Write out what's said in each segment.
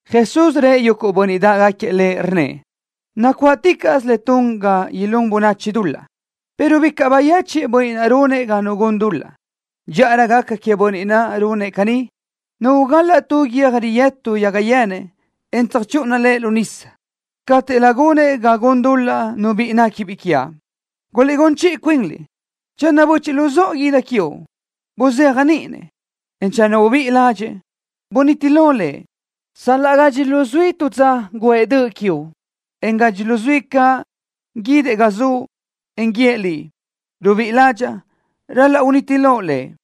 Jesús rëʼ yuguʼ bönniʼ dáʼgaquiëʼ Lëʼ, rnnëʼ: —Nacuáʼticaʼsö le tun ga ilún bönachi dul-laʼ, pero bicaʼ bayechiʼ bönniʼ naʼ runëʼ ga nu gun dul-laʼ. Dxíʼarö gaca queëʼ bönniʼ naʼ runëʼ caní, nu ugal-laʼ tu guiö́j riyëtu yaga yenëʼ, en tsöjchúʼuna lëʼ lu nísadoʼ, cáteʼlö gunëʼ ga gun dul-laʼ nu biʼi néquibiʼ quiaʼ. Guliʼgún chiʼi cuinliʼ. Channö böchiʼ luzóʼo guʼë döʼ quiuʼ, buzéajniʼi-nëʼ, en channö ubíʼi ládxëʼë, buniti lo lëʼ. Sal-laʼ gadxi luzuí tu dza guʼë döʼ quiuʼ, en gadxi luzuí caʼ guídëʼ ga zuʼ, en guíëʼ liʼ: “Rubíʼi ládxaʼa”, ral-laʼ uniti loʼ lëʼ.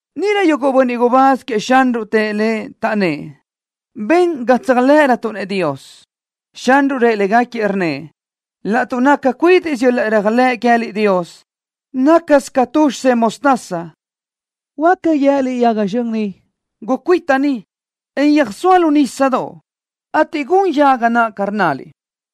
Níʼirö yuguʼ bönniʼ gubáz queëʼ Xanruʼ tëʼ Lëʼ, taʼnnë́ʼ: —Ben ga tséajlëʼërötuʼ-nëʼ Dios. Xanruʼ rëʼ légaquiëʼ, rnnëʼ: —Laʼtuʼ naca cuídiʼsö yöl-laʼ réajlëʼ queë́liʼ Dios, nácasö ca tu xisedoʼ mostaza, huáca guië́liʼ yaga zxön ni: “Gucuíta ni, en yöjsóa lu nísadoʼ”, ateʼ gun yaga naʼ ca rnnaliʼ.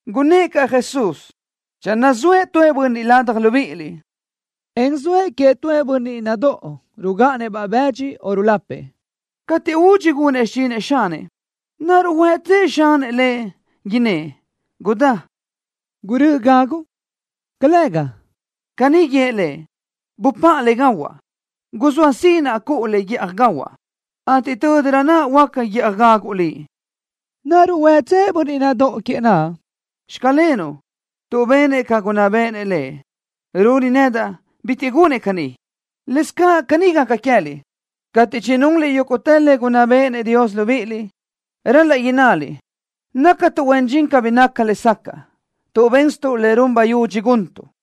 Gunnë́ʼ caʼ Jesús: —Channö zoëʼ tuëʼ bönniʼ ladaj libíʼiliʼ, en zoëʼ queëʼ tuëʼ bönniʼ nadóʼo rugáʼanëʼ-baʼ bëdxi o rulapëʼ, cateʼ údxi gunëʼ xichinëʼ xanëʼ, ¿naruʼ huëtsëʼ xanëʼ lëʼ, innë́ʼ: “Gudá, gurö́ʼö gaguʼ”? ¡Calëga! Caní guíëʼ lëʼ: “Bupáʼa le gahuaʼ. Guzóa sinaʼ cuʼu le guíʼaj gahuaʼ, ateʼ tö́dirö naʼ huáca guíʼaj gaguʼ liʼ.” ¿Naruʼ huëtsëʼ bönniʼ nadóʼo queëʼ naʼ: “Xclenuʼ”, tuʼ benëʼ ca gunná béʼenëʼ lëʼ? Runi nedaʼ, bitiʼ gunëʼ caní. Lëscaʼ caní gaca queë́liʼ. Cateʼ chinunliʼ yúguʼtë le gunná béʼenëʼ Dios libíʼiliʼ, ral-laʼ innaliʼ: “Nácatuʼ huen dxin cabí nácatuʼ lesacaʼ, tuʼ bénsötuʼ le run bayudxi guntuʼ.”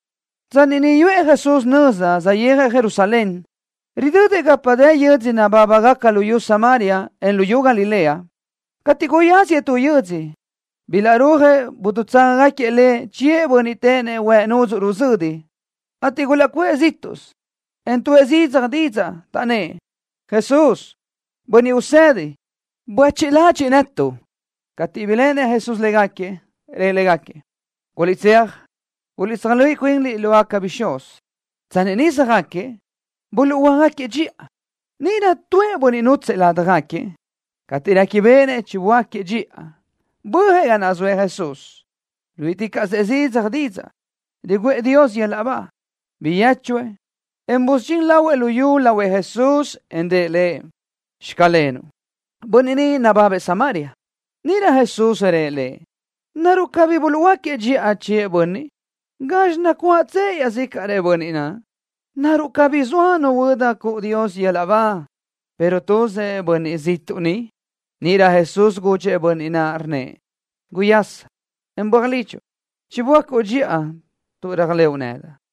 Tsanni niʼ yuʼë Jesús nöza, saʼyéajëʼ Jerusalén, ridödëʼ gapa dë yö́dzödoʼ nabábagaca luyú Samaria, en luyú Galilea. Cateʼ guyáziëʼ tu yö́dzödoʼ, bilaʼrúajëʼ dutságagaquiëʼ Lëʼ chiëʼ bönniʼ téʼenëʼ huëʼ nudzuʼ ruzödi, ateʼ gulaʼcuʼë zíʼtuʼsö, en tuʼë zidzaj didzaʼ, taʼnnë́ʼ: —¡Jesús, Bönniʼ Usedi! ¡Buéchiʼ ladxiʼ netuʼ! Cateʼ biléʼenëʼ Jesús légaquiëʼ, rëʼ légaquiëʼ: —Guliʼtséaj, guliʼtsöjluíʼi cuinliʼ lógaca bixúz. Tsanni niʼ söjáquiëʼ, buluʼhuöáquiëʼ dxiʼa. Níʼirö tuëʼ bönniʼ nútsëʼë ládjagaquiëʼ, cateʼ réquibeʼenëʼ chinuhuöáquiëʼ dxiʼa, bö́ajëʼ ga naʼ zoëʼ Jesús, ruíʼiticaʼsëʼ zidzaj didzaʼ, riguʼë Dios yöl-laʼ ba. Biyéchuëʼ, en busudxín lahuëʼ lu yu lahuëʼ Jesús, en rëʼ Lëʼ: “¡Xclenuʼ!” Bönniʼ ni nababëʼ Samaria. Níʼirö Jesús rëʼ lëʼ: —¿Naruʼ cabí buluʼhuöáquiëʼ dxiʼa chiëʼ bönniʼ? ¿Gazxi nacuáʼtsëʼ iaʼzícaʼrëʼ bönniʼ naʼ? ¿Naruʼ cabí zoa nu huöda cuʼu Dios yöl-laʼ ba, pero tuzëʼ bönniʼ ziʼtuʼ ni? Níʼirö Jesús gudxëʼ bönniʼ naʼ, rnnëʼ: —¡Guyasa, en böaj lidxuʼ! ¡Chiböácuʼ dxiʼa tuʼ réajlëʼu nedaʼ!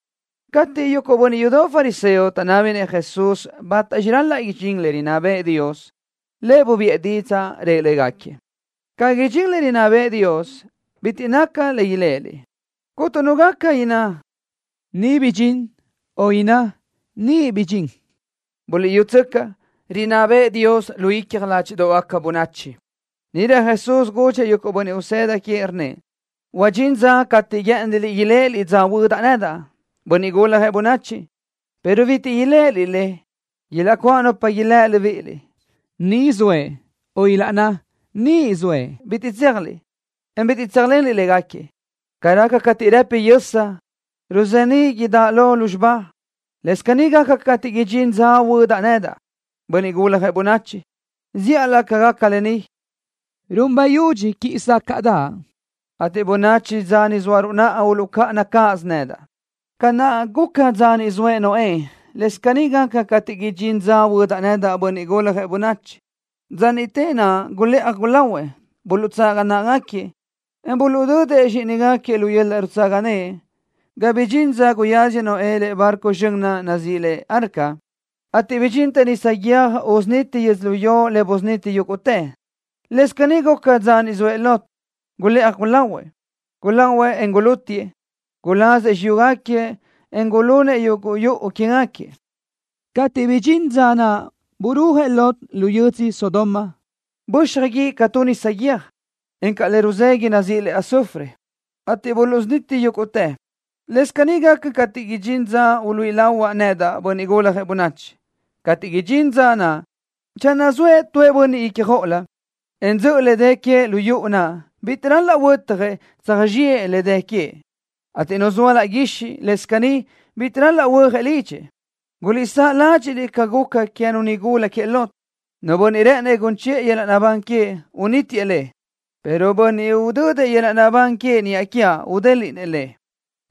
Cateʼ yuguʼ bönniʼ yudoʼ fariseo taʼnábinëʼ Jesús bátaxi ral-laʼ idxín le rinná bëʼë Dios, Lëʼ bubiʼë didzaʼ, rëʼ légaquiëʼ: —Ca idxín le rinná bëʼë Dios, bitiʼ naca le iléʼeliʼ. Cuntu nu gaca inná: “¡Ni bidxín!”, o inná: “¡Niʼ bidxín!” ¡Buliʼyútsöcaʼ! ¡Rinná bëʼë Dios lu icja ládxiʼdoʼgaca bönachi! Níʼirö Jesús gudxëʼ yuguʼ bönniʼ usëda queëʼ, rnnëʼ: —Huadxín dza cateʼ guë́ʼëniliʼ iléʼeliʼ dza huödaʼ nedaʼ, Bönniʼ Guljëʼ Bönachi, pero bitiʼ iléʼeliʼ le. Ilaʼcuáʼ nupa ilë́ libíʼiliʼ: “¡Ni zoëʼ!”, o ilaʼnná: “¡Niʼ zoëʼ!” Bitiʼ tséajliʼ niʼ, en bitiʼ tséajlenliʼ légaquiëʼ. Ca raca cateʼ rëpi yösa, ruzeníʼ idáʼalö lúzxiba, lëscaʼ caní gaca cateʼ idxín dza huödaʼ nedaʼ, Bönniʼ Guljëʼ Bönachi. Zíʼalö ca gaca lë ni, run bayudxi quíʼi sácaʼdaʼ, ateʼ bönachi dza ni zóaruʼ naʼa uluʼcáʼana nedaʼ cáʼasö. Ca naʼ guca dza niʼ zoëʼ Noé, lëscaʼ caní gaca cateʼ idxín dza huödaʼ nedaʼ, Bönniʼ Guljëʼ Bönachi. Dza niʼte naʼ gulëʼaj gulahuëʼ. Buluʼtsaga náʼagaquiëʼ, en buluʼdödëʼ zxíʼinigaquiëʼ lu yöl-laʼ rutsaga naʼ ga bidxintë dza guyáziëʼ Noé lëʼe barco zxön naʼ nazíʼi le arca, ateʼ bidxintë nisa guiö́j usuniti yödzölió le busuniti yúguʼtëʼ. Lëscaʼ caní guca dza niʼ zoëʼ Lot. Gulëʼaj gulahuëʼ. Guláʼuëʼ, en gulútiʼë. Gulazëʼ xiyúgaquiëʼ, en gulunëʼ yuguʼ yuʼu quégaquiëʼ. Cateʼ bidxín dza naʼ burúajëʼ Lot lu yödzö Sodoma, böxaj guíʼ ca tu nisa guiö́j, encaʼ le ruzéguidaʼ nazíʼi le azufre, ateʼ buluʼsuniti yúguʼtëʼ. Lëscaʼ caní gaca cateʼ idxín dza uluíʼi lahuaʼ nedaʼ, Bönniʼ Guljëʼ Bönachi. ’Cateʼ idxín dza naʼ, channö zoëʼ tu bönniʼ ícjoʼolö, en dzöʼö le dë queëʼ lu yuʼu naʼ, bitiʼ ral-laʼ huötjëʼ tsöjzxiʼë le dë queëʼ, ateʼ nu zoa laʼ guixiʼ, lëscaʼ caní, bitiʼ ral-laʼ huöjëʼ lidxëʼ. Guliʼsáʼ ládxiʼliʼ ca guca queë́nu nigula queëʼ Lot. Nu bönniʼ rë́ʼënëʼ gun chiʼë yöl-laʼ naʼbán queëʼ, unítiëʼ le, pero bönniʼ udödëʼ yöl-laʼ naʼbán queëʼ niʼa quiaʼ, udélëʼë le.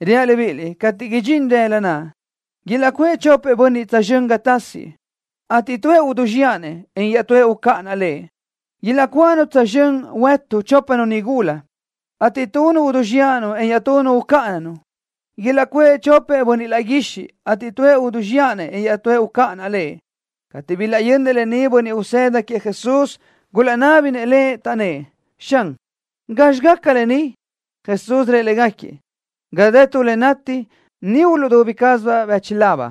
’Reaʼ libíʼiliʼ: Cateʼ idxín rëla naʼ, ilaʼcuʼë chopëʼ bönniʼ tsözxö́n ga tasiëʼ, ateʼ tuëʼ uduzxiʼa-nëʼ, en iaʼtúëʼ ucáʼanaʼ lëʼ. Ilaʼcuáʼanu huëtu tsözxö́n chópanu nigula, ateʼ tunu uduzxiʼa-nu, en iaʼtunu ucáʼanaʼ-nu. Ilaʼcuʼë chopëʼ bönniʼ laʼ guixiʼ, ateʼ tuëʼ uduzxiʼa-nëʼ, en iaʼtúëʼ ucáʼanaʼ lëʼ. Cateʼ bilaʼyönnëʼ lë ni bönniʼ usëda queëʼ Jesús, gulaʼnábinëʼ Lëʼ, taʼnnë́ʼ: —Xan, ¿gazxi gaca lë ni? Jesús rëʼ légaquiëʼ: —Ga dë tu le nati, niʼ uluʼdubi quézibaʼ bíchulab.